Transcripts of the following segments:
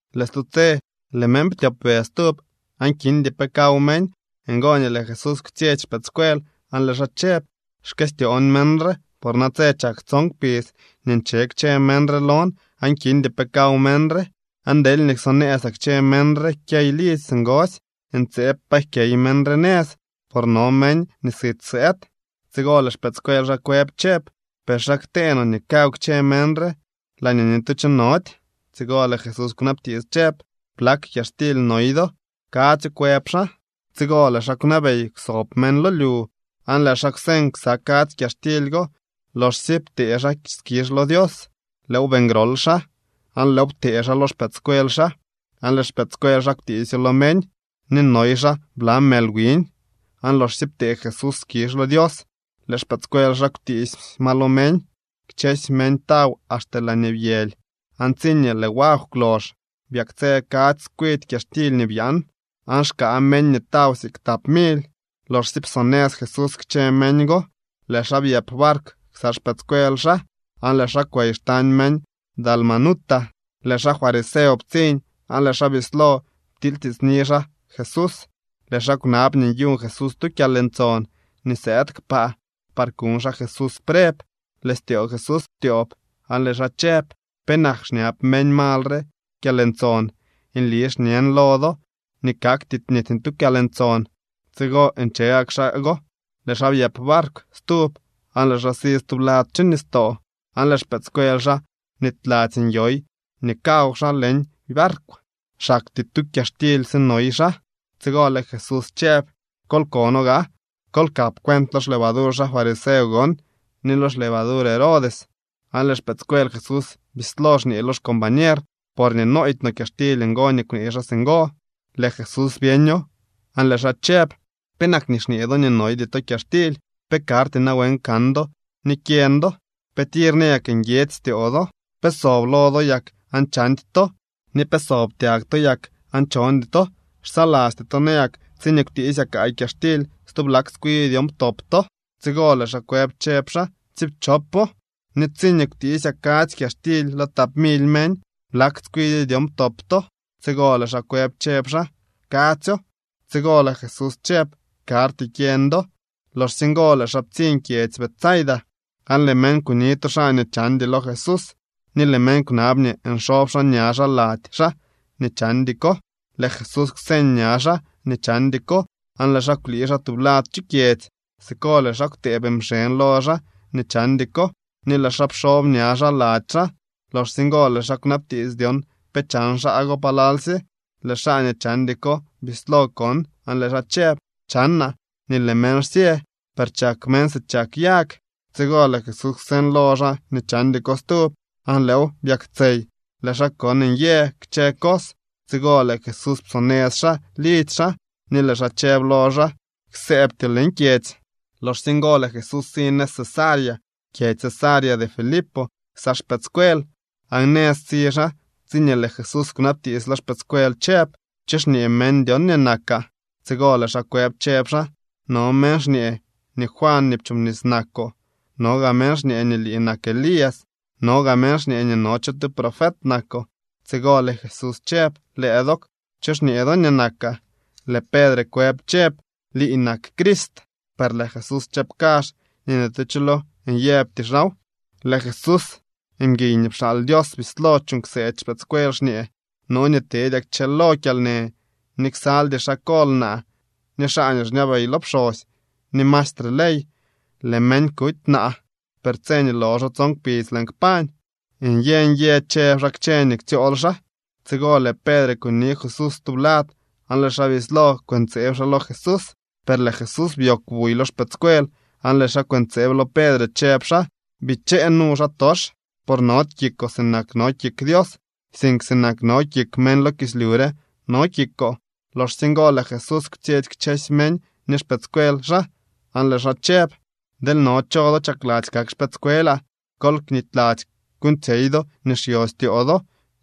Lëë stu tse lëë meñ ptyopbe stub aan kindy pe kaw meñ. Ngo nii lëë Jesús kwtsyetsy xpëëdscuel aan lëë xaa chëb: —Xkëstyoon meñ re por natse chak tson kpidz nii nche kchë meñ re lon aan kindy pe kaw meñ re. Aan deelñee ksonëëzaa kchë meñ re kyey lidzy singosy, ntseeb pa jkyey meñ re nëz, por no meñ nii sit sëëd. Tsigo lëë xpëëdscuel xaa kwëb chëb: —¿Per xa ktee no nii kaw kchë meñ re laañee ni tu cho nody? Tsigo lëë Jesús kwnabtiits chëb: —¿Blak kyaxtily noy do? —Kadzyo —kwëb xaa. Tsigo lëë xaa kwnabey kwsob meñ lo lyu. Aan lëë xaa kwseñ ksa kadzy kyaxtily go. Loxsye ptee xaa skizh lo Dios, lëëw beeñ grol xaa aan lëëw ptee xaa lo xpëëdscuel xaa, aan lëë xpëëdscuel xaa kwtiisyo lo meñ. Ni noy xaa bla mël wiñ, aan loxsye ptee Jesús skizh lo Dios, lëë xpëëdscuel xaa kwtiisy ma lo meñ. Kchësy meñ taw axte laañee byëly, aan tsiñee lëë wagw kwlox, byaktsë kadzy tskwidy kyaxtily nii byaan. Aan xkaa meñ nii taw siik tap mily. Loxsye psonëz Jesús kchë meñ go, lëë xaa byëp barkw ksa xpëëdscuel xaa aan lëë xaa kwey xtañ meñ Dalmanuta. Lëë xaa fariseo ptsiñ aan lëë xaa bislo ptilytiitsni xaa Jesús. Lëë xaa kwnab nii nyuñ Jesús tu kyalntson nii sëëd kpaa par kuñ xaa Jesús preb. Lëë styoo Jesús ptyoob aan lëë xaa chëb: —¿Penak xñab meñ mal re kyalntson? Nli xñen lo do nii kakty ni tu kyalntson. Tsigo nche gak xaa go, lëë xaa byëp barkw stub aan lëë xaa si stublad chu nistoo. Aan lëë xpëëdscuel xaa bnityladzy nyoy nii kaw xaa leñ barkw. Xaktyee tu kyaxtily sinoy xaa. Tsigo lëë Jesús chëb: —Kol kono gaa, kol kap cuent lo xlevadur xaa fariseo gon ni lo xlevadur Herodes. Aan lëë xpëëdscuel Jesús bislo xñee lo xcombañer: —Porñee nooydy no kyaxtily ngo nii kwnee xaa singo. Lëë Jesús byeño aan lëë xaa chëb: —¿Penak nii xñee do nii noydy to kyaxtily? ¿Pe karty nawen kan do ni kyeñ do? ¿Pe tir nayak nguiedzy styoo do? ¿Pe sob lo do yak aan chandy to, ni pe sob tyag to yak aan chondy to? ¿Xsalasty to nayak tsiñee kwtiisyaa kaay kyaxtily nii byaan dyon ptop to? Tsigo lëë xaa kwëb chëb xaa: —Tsiipchopo. Ni tsiñee kwtiisyaa kadzy kyaxtily lo tap mily meñ, ¿blak tskwidyo dyon ptop to? Tsigo lëë xaa kwëb, chëb xaa: —Kadzyo. Tsigo lëë Jesús chëb: —Karty kyeñ do. Loxsye ngo lëë xaa ptsiñ kyedzy Betsaida, aan lëë meñ kuni tu xaa nii chandy lo Jesús, ni lëë meñ kwnab nii nxob xaa ña xaa lady xaa nii chandy ko. Lëë Jesús kwseñ ña xaa nii chandy ko aan lëë xaa kwlii xaa tublad chu kyedzy. Siko lëë xaa kwtëëb mxeñ lo xaa nii chandy ko, ni lëë xaa pxob ña xaa lady xaa. Loxsye ngo lëë xaa kwnabtiits dyon pe chan xaa go palalsye. Lëë xaa nii chandy ko bislo kon aan lëë xaa chëb: —Chanaa nii lëë meñ xsyë, per chak meñ si chak yag. Tsigo lëë Jesús kwseñ lo xaa nii chandy ko stub aan lëëw byaktsey. Lëë xaa kon nyë kchë cos. Tsigo lëë Jesús psonëz xaa lidzy xaa ni lëë xaa chëb lo xaa: —Ksëëbtyoo leñ kyedzy. Loxsye ngo lëë Jesús si nëz Cesarea kyedzy Cesarea de Filipo ksa xpëëdscuel. Aan nëz si xaa tsiñee lëë Jesús kwnabtiits lo xpëëdscuel chëb: —¿Cho xñee meñ dyon nii nakaa? Tsigo lëë xaa kwëb chëb xaa: —No meñ xñee nii Juan nii pchoobnis nakoo, no gaa meñ xñee nii lii nak Elías, no gaa meñ xñee nii no cho tu profet nakoo. Tsigo lëë Jesús chëb: —Lëë dook, ¿cho xñee do nii nakaa? Lëë Pedre kwëb chëb: —Lii nak Crist. Per lëë Jesús chëb kazh nii ni tu cho lo nyëbty xaaw. Lëë Jesús, mguiy nii pxaal Dios, bislo chuuñ kseedy xpëëdscuel xñee: —No nii teedyaa kchëlo kyalnë, ni ksaldy xaa kol naa, ni xaa nii xñabey lo pxosy, ni maestre ley. Lëë meñ kuty naa, per tse nii loxo tson kpidz lëën kpañ. Nyë nyë chëb xaa kchë nii ktsyool xaa. Tsigo lëë Pedre kuni Jesús tublad aan lëë xaa bislo kwëntseeb xaa lo Jesús. Per lëë Jesús byoogw buy lo xpëëdscuel aan lëë xaa kwëntseeb lo Pedre chëb xaa: —¡Bichee nu, xaatox! Por nody kikoo sinak no kik Dios, sink sinak no kik meñ lo kislyu re no kikoo. Loxsye ngo lëë Jesús kwtsyetsy kchësy meñ ni xpëëdscuel xaa aan lëë xaa chëb: —Deel no cho do chakladzy kak xpëëdscuelaa, kol knityladzy kuuñtsyey do nii xyo styoo do,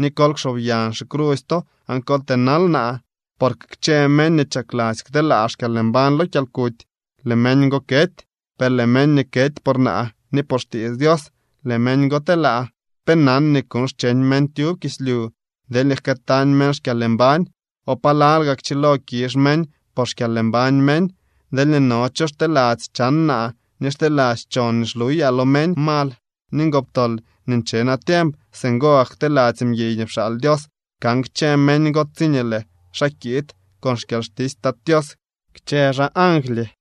ni kol kxob yañ xicrusy to aan kol tënal naa. Porque kchë meñ nii chakladzy kteelaa xkyalmbañ lo kyalkuty, lëë meñ go kety. Per lëë meñ nii kety por naa ni por xtiits Dios, lëë meñ go telaa. ¿Pe nan nii kuuñ xcheñ meñ tyub kislyu deelñee jkëëtañ meñ xkyalmbañ? ¿O palal gaa kchilo kizh meñ por xkyalmbañ meñ? Deelñee no cho xteladzy chan naa ni xteladzy chon nii xluyaa lo meñ mal ni ngoptol nii nche natiemp, singo gak kteladzy mguiy nii pxaal Dios kan kchë meñ go tsiñee lëë xaa kiid con xkyalxtisy Tat Tios kchë xaa angly.